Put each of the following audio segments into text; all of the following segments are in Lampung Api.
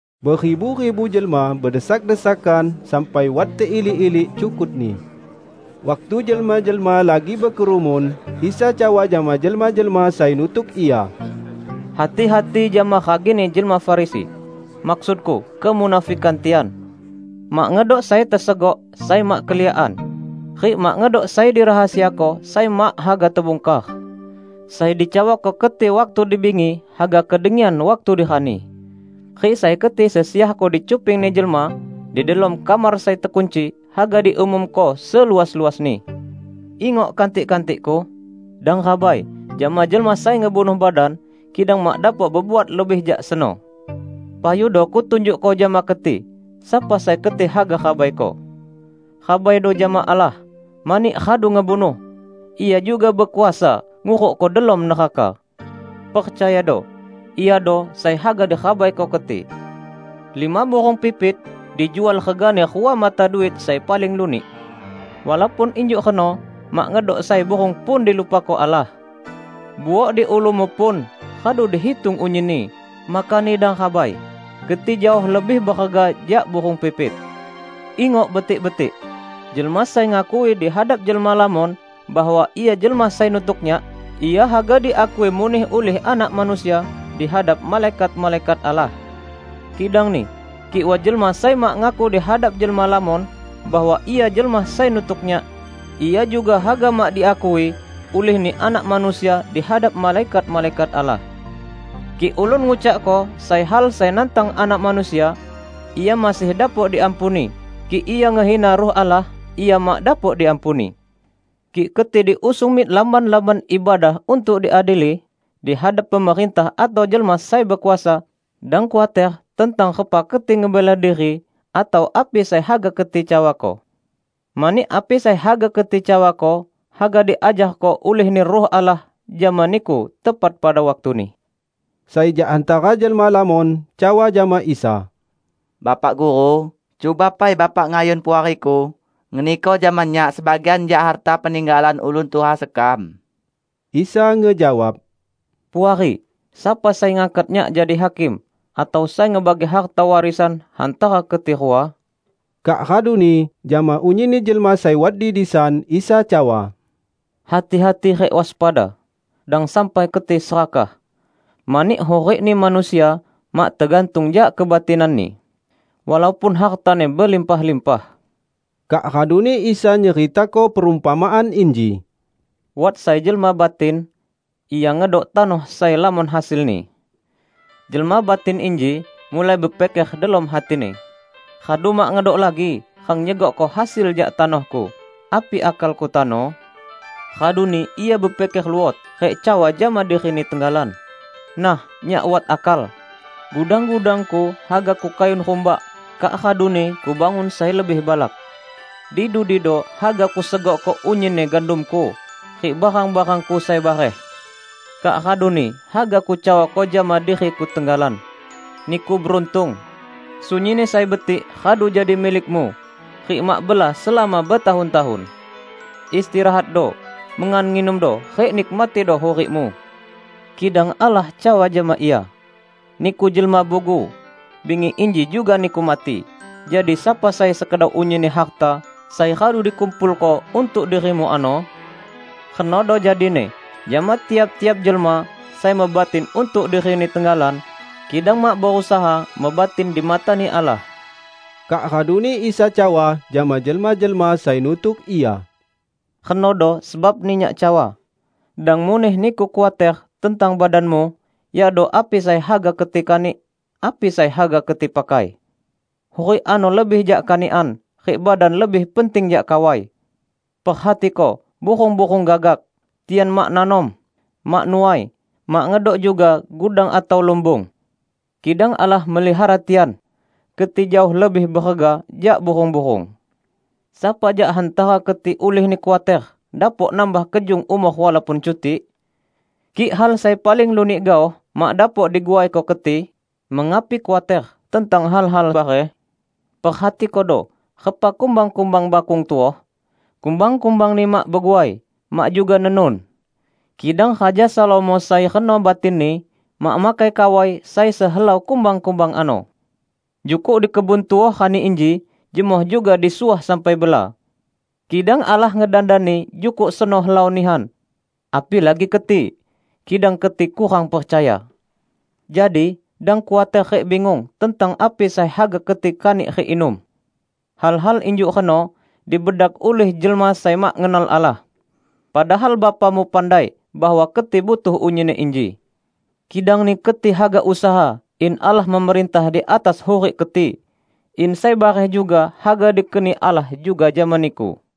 Beribu-ribu jelma bedesak-desakan sampai wat teilik-ilik cukutni. Waktu jelma-jelma lagi bekerumun, Isa cawa jama jelma-jelma sai nutuk Ia, "Hati-hati jama ragini jelma Farisi, maksud-Ku, kemunafikan tian. Mak ngedok sai tesegok, sai mak keliakan, rik mak ngedok sai dirahasiako sai mak haga tebungkar. Sai dicawako keti waktu dibingi, haga kedengian waktu di rani; rik sai keti sesiahko dicupingni jelma di delom kamar sai tekunci, haga diumumko seluas-luasni." "Ingok, kantik-kantik-Ku! Dang rabai jama jelma sai ngebunuh badan kidang mak dapok bebuat lebih jak seno. Payudo Kutunjukko jama keti sapa sai keti haga rabaiko. Rabaido jama Allah! Mani radu ngebunuh, Ia juga bekuasa ngurukko delom neraka! Percayado, Iado sai haga dirabaiko keti. Lima burung pipit dijual regani rua mata duit sai paling lunik. Walaupun injuk reno mak ngedok sai burung pun dilupako Allah. Buok di ulumu pun radu dihitung unyinni, makani dang rabai; keti jaoh lebih berega jak burung pipit!" "Ingok betik-betik: Jelma sai ngakui di hadap jelma lamon bahwa ia jelma sai nutuk Nyak, ia haga diakui muneh ulih Anak Manusia di hadap malaikat-malaikat Allah. Kidangni kik wat jelma sai mak ngaku di hadap jelma lamon bahwa ia jelma sai nutuk Nyak, ia juga haga mak diakui ulihni Anak Manusia di hadap malaikat-malaikat Allah. Kik ulun ngucakko sai hal sai nantang Anak Manusia, ia masih dapok diampuni; kik ia ngehina Ruh Allah, ia mak dapok diampuni. Kik keti diusung mik lamban-lamban ibadah untuk diadili di hadap pemerintah atau jelma sai bekuasa, dang khuater tentang repa keti ngebela diri atau api sai haga keti cawako. Mani api sai haga keti cawako haga diajarko ulih-Ni Ruh Allah jama niku tepat pada waktuni." Sai jak hantara jelma lamon cawa jama Isa, "Bapak Guru, cuba pai Bapak ngayun puariku ngeniko jama nyak sebagian jak harta peninggalan ulun tuha sekam." Isa ngejawab, "Puari, sapa sai ngangkat Nyak jadi hakim atau sai ngebagi harta warisan hantara keti rua?" Kak raduni jama unyinni jelma sai wat di disan Isa cawa, "Hati-hati rik waspada, dang sampai keti serakah. Mani hurikni manusia mak tegantung jak kebatinanni, walaupun hartani belimpah-limpah." Kak raduni Isa nyeritako perumpamaan inji, "Wat sai jelma batin. Ia ngedok tanoh sai lamon hasilni. Jelma batin inji mulai bepiker delom hatini, 'Radu mak ngedok lagi rang nyegokko hasil jak tanohku. Api akalku tano?' Raduni ia bepiker luot rik cawa jama dirini tenggalan, 'Nah, nyak wat akal; gudang-gudangku haga kukayun rumbak kak raduni kubangun sai lebih balak. Di dudido haga kusegokko unyinni gandumku rik barang-barangku sai bareh. Kak raduni haga kucawako jama diriku tenggalan: Niku beruntung! Sunyinni sai betik radu jadi milikmu rik mak bela selama betahun-tahun. Istirahatdo! Mengan nginumdo rik nikmatido hurikmu!' Kidang Allah cawa jama ia, 'Niku jelma bugu! Bingi inji juga niku mati, jadi sapa sai sekedau unyinni harta sai radu dikumpulko untuk dirimu ano?' Renodo jadini jama tiap-tiap jelma sai mebatin untuk dirini tenggalan, kidang mak berusaha mebatin di matani Allah." Kak raduni Isa cawa jama jelma-jelma sai nutuk Ia, "Renodo sebabni Nyak cawa, 'Dang muneh niku khuater tentang badanmu, yakdo api sai haga keti kanik, api sai haga keti pakai.' Hurik ano lebih jak kanikan, rik badan lebih penting jak kawai. Perhatiko burung-burung gagak! Tian mak nanom, mak nuai, mak ngedok juga gudang atau lumbung. Kidang Allah melihara tian! Keti jaoh lebih berega jak burung-burung! Sapa jak hantara keti ulihni khuater dapok nambah kejung umor walaupun cutik? Kik hal sai paling lunik gaoh mak dapok diguaiko keti, mengapi khuater tentang hal-hal bareh? Perhatikodo repa kumbang-kumbang bakung tuoh; kumbang-kumbangni mak beguai, mak juga nenun. Kidang Raja Salomo sai reno batinni mak makai kawai sai sehelau kumbang-kumbang ano! Jukuk di kebun tuoh rani inji jemoh juga disuah sampai bela. Kidang Allah ngedandani jukuk seno helau nihan. Apilagi keti! Kidang keti kurang percaya! Jadi, dang khuater rik bingung tentang api sai haga keti kanik rik inum. Hal-hal injuk reno dibedak ulih jelma sai mak ngenal Allah. Padahal Bapamu pandai bahwa keti butuh unyinni inji. Kidangni keti haga usaha in Allah memerintah di atas hurik keti, in sai bareh juga haga dikeni Allah juga jama niku."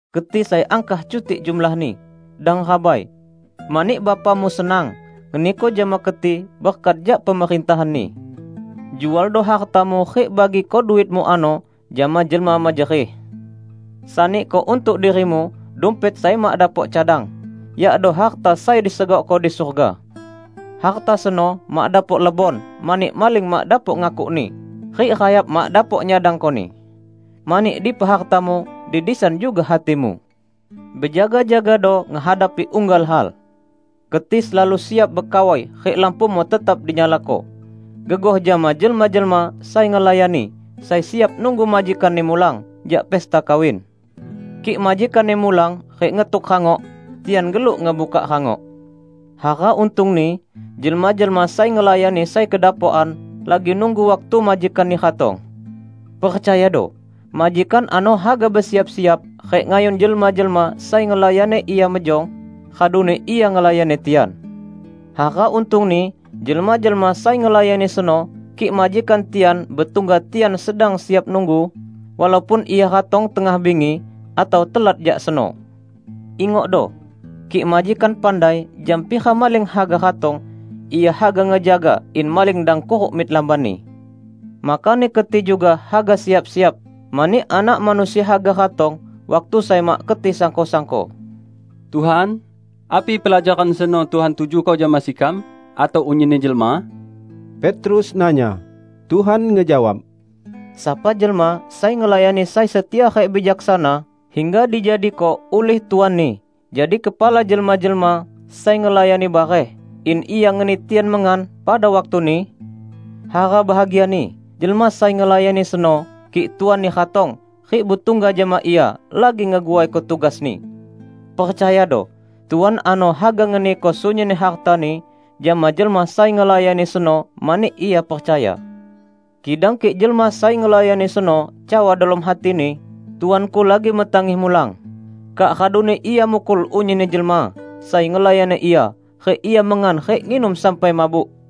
"Keti sai angkah cutik jumlahni, dang rabai! Mani Bapamu senang ngeniko jama keti berkat jak Pemerintahan-Ni. Jualdo hartamu rik bagiko duitmu ano jama jelma mejerih. Saniko untuk dirimu dumpet sai mak dapok cadang, yakdo harta sai disegokko di surga. Harta seno mak dapok lebon mani maling mak dapok ngakukni rik rayap mak dapok nyadangkoni. Mani dipa hartamu, di disan juga hatimu!" "Bejaga-jagado ngehadapi unggal hal. Keti selalu siap bekawai rik lampumu tetap dinyalako, gegoh jama jelma-jelma sai ngelayani sai siap nunggu majikanni mulang jak pesta kawin. Kik majikanni mulang rik ngetuk rangok, tian geluk ngebuka rangok. Hara untungni jelma-jelma sai ngelayani sai kedapokan lagi nunggu waktu majikanni ratong. Percayado: majikan ano haga besiap-siap rik ngayun jelma-jelma sai ngelayani ia mejong, raduni ia ngelayani tian. Hara untungni jelma-jelma sai ngelayani seno kik majikan tian betungga tian sedang siap nunggu, walaupun ia ratong tengah bingi atau telat jak seno! Ingokdo! Kik majikan pandai jam pira maling haga ratong, ia haga ngejaga in maling dang kuruk mik lambanni. Makani keti juga haga siap-siap, mani Anak Manusia haga ratong waktu sai mak keti disangko-sangko." "Tuhan, api pelajaran seno Tuhan tujuko jama sekam atau unyinni jelma?" Petrus nanya. Tuhan ngejawab, "Sapa jelma sai ngelayani sai setia rik bijaksana hingga dijadiko ulih tuanni jadi kepala jelma-jelma sai ngelayani bareh in ia ngeni tian mengan pada waktuni? Hara bahagiani jelma sai ngelayani seno kik tuanni ratong rik betungga jama ia lagi ngeguaiko tugasni! Percayado: Tuan ano haga ngeniko sunyinni hartani jama jelma sai ngelayani seno mani ia percaya. Kidang kik jelma sai ngelayani seno cawa delom hatini, 'Tuanku lagi metangih mulang,' kak raduni ia mukul unyinni jelma sai ngelayani ia rik ia mengan rik nginum sampai mabuk,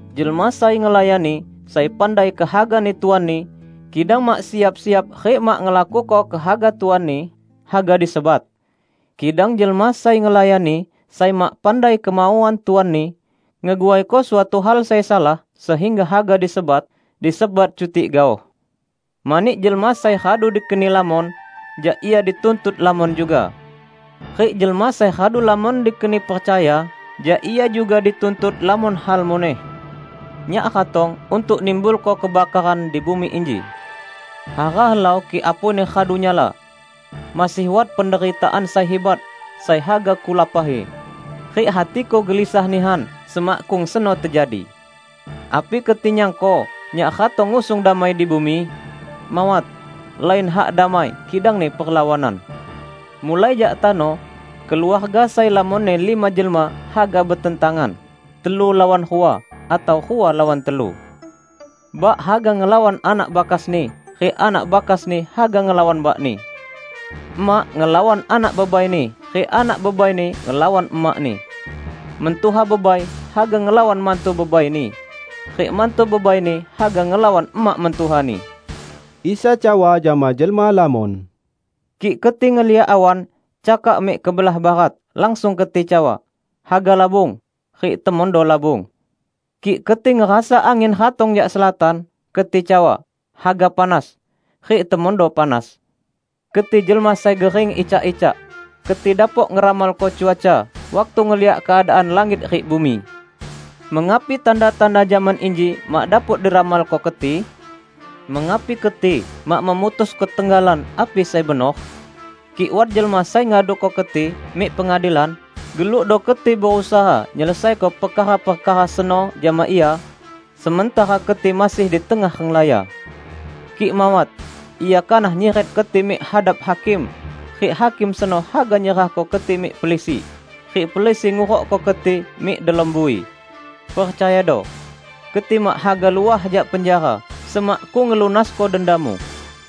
Jelma sai ngelayani sai pandai kehagani tuanni, kidang mak siap-siap rik mak ngelakuko kehaga tuanni, haga disebat. Kidang jelma sai ngelayani sai mak pandai kemauan tuanni, ngeguaiko suatu hal sai salah sehingga haga disebat, disebat cutik gaoh. Mani jelma sai radu dikeni lamon, jak ia dituntut lamon juga. Rik jelma sai radu lamon dikeni percaya jak ia juga dituntut lamon hal muneh." "Nyak ratong untuk nimbulko kebakaran di bumi inji. Hara helau kik apuini radu nyala! Masih wat penderitaan sai hibat sai haga Kulapahi. Rik hati-Ku gelisah nihan semakkung seno tejadi. Api keti nyangko Nyak ratong ngusung damai di bumi? Mawat, lain hak damai, kidangni perlawanan. Mulai jak tano, keluarga sai lamonni lima jelma haga betentangan, telu lawan rua, atau rua lawan telu. Bak haga ngelawan anak bakasni rik anak bakasni haga ngelawan bakni. Emak ngelawan anak bebaini rik anak bebaini ngelawan emakni. Mentuha bebai haga ngelawan mantu bebaini rik mantu bebaini haga ngelawan emak mentuhani." Isa cawa jama jelma lamon, "Kik keti ngeliak awan cakak mik kebelah barat, langsung keti cawa, 'Haga labung.' Rik temondo labung. Kik keti ngerasa angin ratong jak selatan, keti cawa, 'Haga panas.' Rik temondo panas. Keti jelma sai gering icak-icak! Keti dapok ngeramalko cuaca waktu ngeliak keadaan langit rik bumi. Mengapi tanda-tanda zaman inji mak dapok diramalko keti?" "Mengapi keti mak memutusko tenggalan api sai benor? Kik wat jelma sai ngaduko keti mik pengadilan, gelukdo keti berusaha nyelesaiko perkara-perkara seno jama ia sementara keti masih di tengah renglaya. Kik mawat, ia kanah nyiret keti mik hadap hakim rik hakim seno haga nyerahko keti mik pelisi, rik pelisi ngurukko keti mik delom bui. Percayado! Keti mak haga luah jak penjara semakkung ngelunasko dendamu."